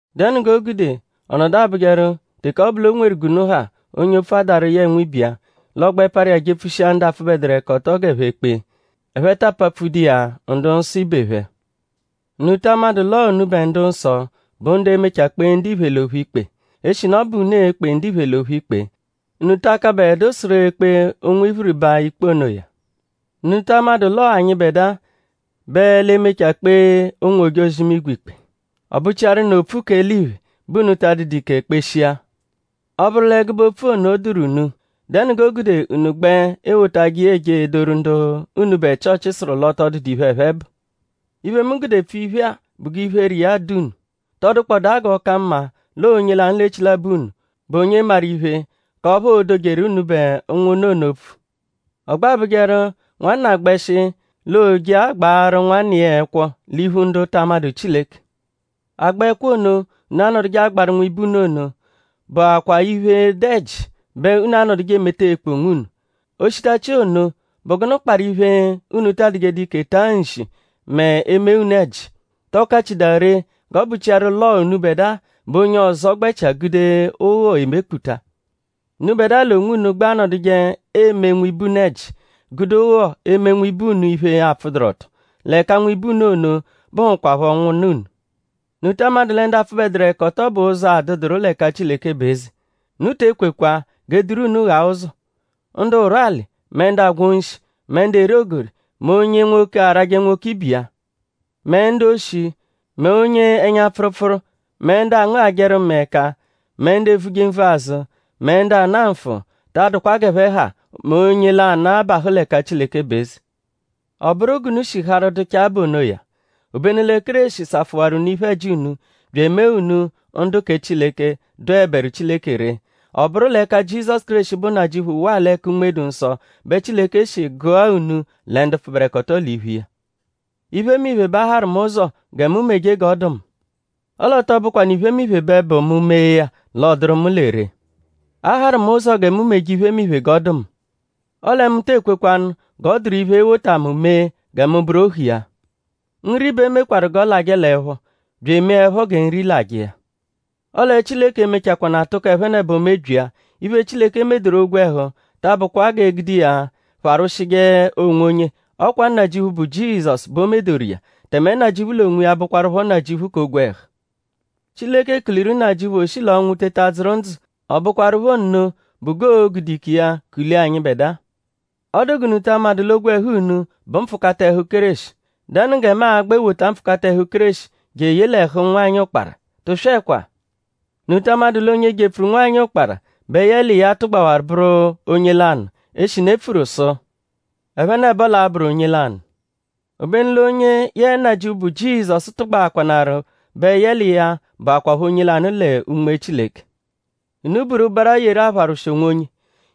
?Dẹnu g'o gude ọ nọdu abụjeru teke ọ bụ l'o nweru g'unu ha onye opfu adaru yẹe nwibe iya; l'ọ gbẹ parụ iya jepfushia ndu apfụbeduru ẹka ọto g'ẹphe kpee; ẹphe ta apapfudu iya ndu-nsọ ibe phẹ? ?Unu ta amadụ l'ọo unubẹ ndu-nsọ bụ ndu e-mechaa kpee ndiphe l'ophu ikpe? Eshinu ọ bụ unu e-kpe ndiphe l'ophu ikpe;?unu ta akabẹdu sụru ekpe ụnwu iphiriba ikpe onoya? ?Unu ta amadụ l'ọo anyịbedua bẹ l'e-mechaa kpee ụnwu-ojozi-imigwe ikpe? Ọ bụchiaru nụ opfu k'eliphe bẹ unu ta adụdu ike kpeshia. Ọ -bụru l'ẹgube opfu ono dụru unu;?dẹnu g'o gude unu gbẹ ewotajẹ iya eje edoru ndu unubẹ Chịochi sụru l'ọ tọ dụdu iphe, ẹphe bụ? Iphe, mu gude epfu iphe-a bụ g'iphere iya dụ unu.?Tọ dụkpodaa g'ọ ka mma l'ọo onye lanụ l'echilabọ unu; bụ onye maru iphe k'ọphu oodojeru unubẹ ụnwunna ono opfu? Ọ gbẹ abụjeru nwanna -gbẹshi l'oo-je agbaarụ nwanna iya ẹkwo l'iphu ndu ta amadụ Chileke. Agba ẹkwo ono, unu anọduje agbaru nwibe unu ono bụakwaa iphe, dụ ẹji bẹ unu anọduje emeta ekpu onwunu. O shitachia ono;?bụ gụnu kparụ iphe, unu ta adụjedu ike taa nshi mẹ e -mee unu ẹji??Tọ kachidaa ree g'ọ bụchiaru l'ọo unubẹdua bẹ onye ọzo gbẹchia gude ụgho emekputa? Unubẹdua l'onwunu gbẹ anọduje eme nwibe unu ẹji; gude ụgho eme nwibe unu iphe, apfụduru-ọto; l'ẹka nwibe unu ono bụhukwapho ụnwunna unu. ?Unu ta amadụ lẹ ndu apfụbeduru-ẹka-ọto bẹ ụzo adụduru l'ẹka Chileke bụ eze? Unu te ekwekwa g'e duru unu ghaa ụzo. Ndu ụrwuali; mẹ ndu agwọ nshi; mẹ ndu eri ogori; mẹ onye nwoke arajẹ nwoke ibe iya; mẹ ndu-oshi; mẹ onye ẹnya-pfụrupfuru; mẹ ndu angụghajeru mẹe ẹka; mẹ ndu evuje nvu azụ; mẹ ndu ana nfụ; ta adụkwa g'ẹphe ha mẹ onye lanụ, abahụ l'ẹka Chileke bụ eze. Ọ bụru g'unu shi harụ dụchaa bụ onoya. Obenu lẹ Kéreshi safụwaru unu iphe-ẹji unu; bya emee unu ndu kẹ Chileke, dụeberu Chileke ree. Ọ bụru l'ẹka Jizọsu Kéreshi, bụ Nnajịuphu waa l'ẹka Unme-dụ-Nsọ bẹ Chileke shi gụa unu lẹ ndu pfụberekoto l'iphu iya. “Iphemiphe bẹ a harụ mu ụzo gẹ mu meje g'ọ dụ mu.” Ọle ọ tọ bụkwanu iphemiphe bẹ bụ mu -mee ya l'ọ dụru mu lẹ ree. “A harụ mu ụzo gẹ mu meje iphemiphe g'ọ dụ mu.” Ọle mu tee kwekwanụ g'ọ dụru iphe, e-wota mu mee gẹ mu bụru ohu iya. “Nri bẹ e mekwarụ g'ọ lajẹ l'ẹpho; bya emee ẹpho gẹ nri lajẹ iya.” Ọle Chileke e-mechakwanaa tụko ẹphenebo mebyia. Iphe, Chileke medoru ogwẹhu ta abụkwa g'e gude iya pharwụshije onwonye; ọ kwa Nnajịuphu, bụ Jizọsu bẹ o medoru iya; tẹme Nnajịuphu l'onwiya bụkwarupho Nnajịuphu k'ogwẹhu. Chileke kuliru Nnajịuphu o shi l'ọnwu teta dzụru ndzụ; ọ bụkwarupho nno bụ g'oo-gude ike iya kulia anyịbedua. ?Ọ dụ g'unu ta amadụ l'ogwẹhu unu bụ mpfụkata ẹhu Kéreshi??Dẹnu gẹ mu a-gbẹ wota mpfụkata ẹhu Kéreshi jeye l'ẹhu nwanyị ụkpara? Tụswekwa! ?Unu ta amadụ l'onye jepfuru nwanyị ụkpara bẹ yẹ l'iya tụgbawaru bụru onye lanụ? Eshinu e pfuru sụ: “Ẹphenebo l'a-bụru onye lanụ.” Obenu l'onye yẹe Nnajịuphu, bụ Jizọsu tụgbaakwanaru bẹ yẹ l'iya bụakwapho onye lanụ lẹ Unme Chileke. Unu buru ụbara yeru apharwụshi onwonye.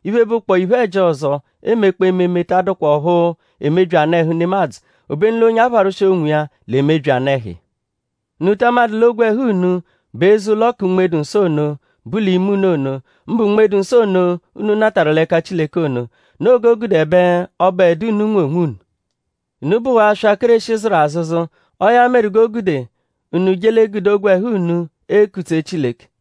Iphe, bụkpoo iphe-ẹji ọzo, eemekpọo ememe ta adụkwa ọphu emebyi anụ-ẹhu nemadzụ; obenu l'onye apharwụshi onwiya l'emebyi anụ-ẹhu iya. ?Unu ta amadụ l'ogwẹhu unu bụ eze-ụlo kẹ Unme-dụ-Nsọ ono, bu l'ime unu ono; mbụ Unme-dụ-Nsọ ono, unu natarụ l'ẹka Chileke ono? Noo g'o gude ẹbe ọ bụedu unu, nwe onwunu. Unu bụwaa aswa, Kéreshi zụru azụzu. Ọo ya meru g'o gude unu je l'egude ogwẹhu unu ekutse Chileke.